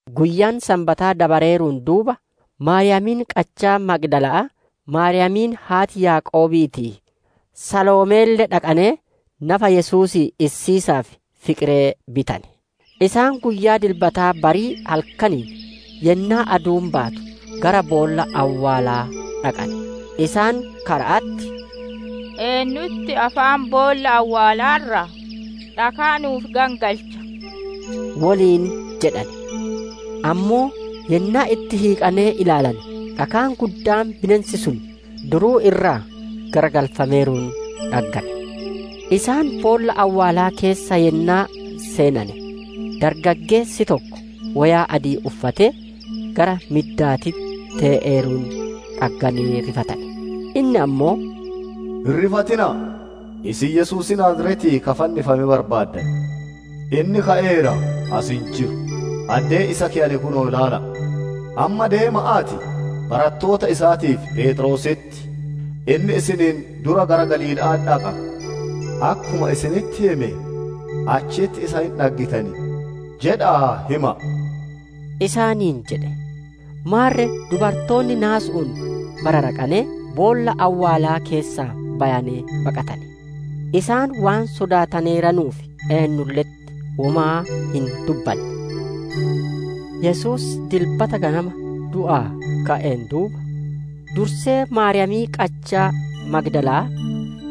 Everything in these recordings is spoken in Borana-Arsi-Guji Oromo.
Guyyaan Sanbataa dabareeruun duuba, Maariyaamiin qachaa Magdala'aa, Maariyaamiin haati Yaaqoobii, Saloomeelle dhaqanee nafa Yesuusii issiisaaf fiqiree bitane. Isaan guyyaa Dilbataa barii halkaniin, yennaa aduun baatu, gara boolla awwaalaa dhaqane. Isaan kara'atti, «Eennutti afaan boolla awwaalaa irraa dhakaa nu'uuf gangalchaa?» woliin jedhane. Ammoo yennaa itti hiiqanee ilaalanee dhakaan guddaan bineensi sun duruu irraa garagalfameeruun dhaggane. Isaan boolla awwaalaa keessa yennaa seenane dargaggeessi tokko, woyaa adii uffatee gara middaatitti tee'eeruun dhagganee rifatane. Inni ammoo, «Hin rifatina'a! Isin Yesuusii Naaziretii ka fannifame barbaaddan. Inni ka'eera; as hin jiru. Addee isa keyane kunoo ilaala'a! Amma deema'aatii, barattoota isaatii fi Pheexroositti, ‹Inni isiniin dura Galiilaa dhaqa; akkuma isinitti hime achitti isa hin dhaggitan› jedha'aa hima'a» isaaniin jedhe. Maarre dubartooti naasu'uun bararaqanee, boolla awwaalaa keessaa bayanee baqatane. Isaan waan sodaataneeranuuf eennulle'etti womaa hin dubbanne. [ Yesuus Dilbata ganama du'aa ka'een duuba, dursee Maariyaamii qachaa Magdala'aa,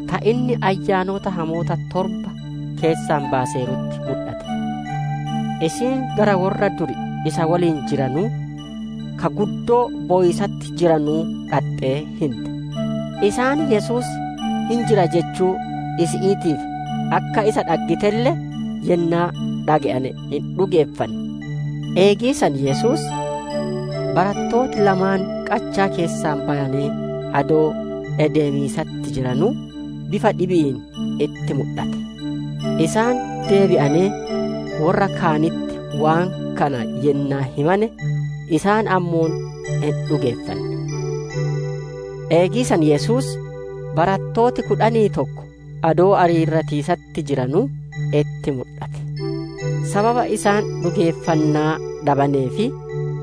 ta inni ayyaanota hamoota torba keessaa baaseerutti mudhate. Isiin gara worra duri isa woliin jiranuu, ka guddoo bowiisatti jiranuu dhaxxee hinte. Isaan Yesuus hin jira jechuu isi'iitii fi akka isa dhaggitelle yennaa dhage'ane hin dhugeeffanne. Eegii san Yesuus, barattooti lamaan qachaa keessaa bayanee adoo ideemiisatti jiranuu akka dhibi'iin itti mudhate. Isaan deebi'anee worra kaanitti waan kana yennaa himane, isaan ammoo hin dhugeeffanne. Eegii san Yesuus, barattooti kudhanii tokko adoo areerratiisatti jiranuu itti mudhate. Sababa isaan dhugeeffannaa dhabanee fi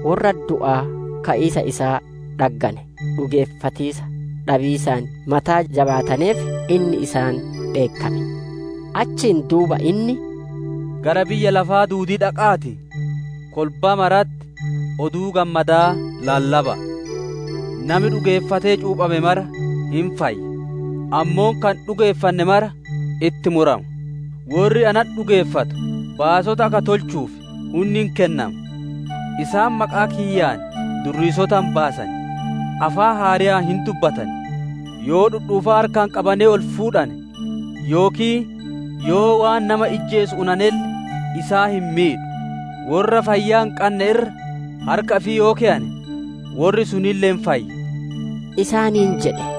worra du'aa ka'iisa isaa dhaggane dhugeeffatiisa dhabiisaan mataa jabaataneef, inni isaan dheekkame. Achiin duuba inni, «Gara biyya lafaa duudii dhaqa'aatii, kolbaa maratti Oduu Gammadaa lallaba'a. Nami dhugeeffatee cuuphame mara hin fayya; ammoo ka hin dhugeeffanne mara itti murama. Worri natti dhugeeffatu baasota akka tolchuuf hunni hin kennama. Isaan maqaa kiyyaan durriisota hin baasan; afaan haareyaan hin dubbatan; Yoo dhudhuufaa harkaan qabanee ol fuudhane, yookiin yoo waan nama ijjeesu unanelle isaan hin miidhu; worra fayyaa hin qanne irra harka ifii yoo keyane, worri sunille hin fayya» isaaniin jedhe.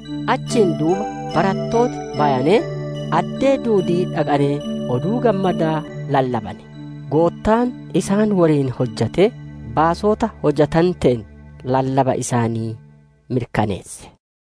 Achiin duuba barattooti bayanee, addee duudii dhaqanee Oduu Gammadaa lallabane; Goottaan isaan woliin hojjatee baasota hojjatanteen lallaba isaanii mirkaneesse.]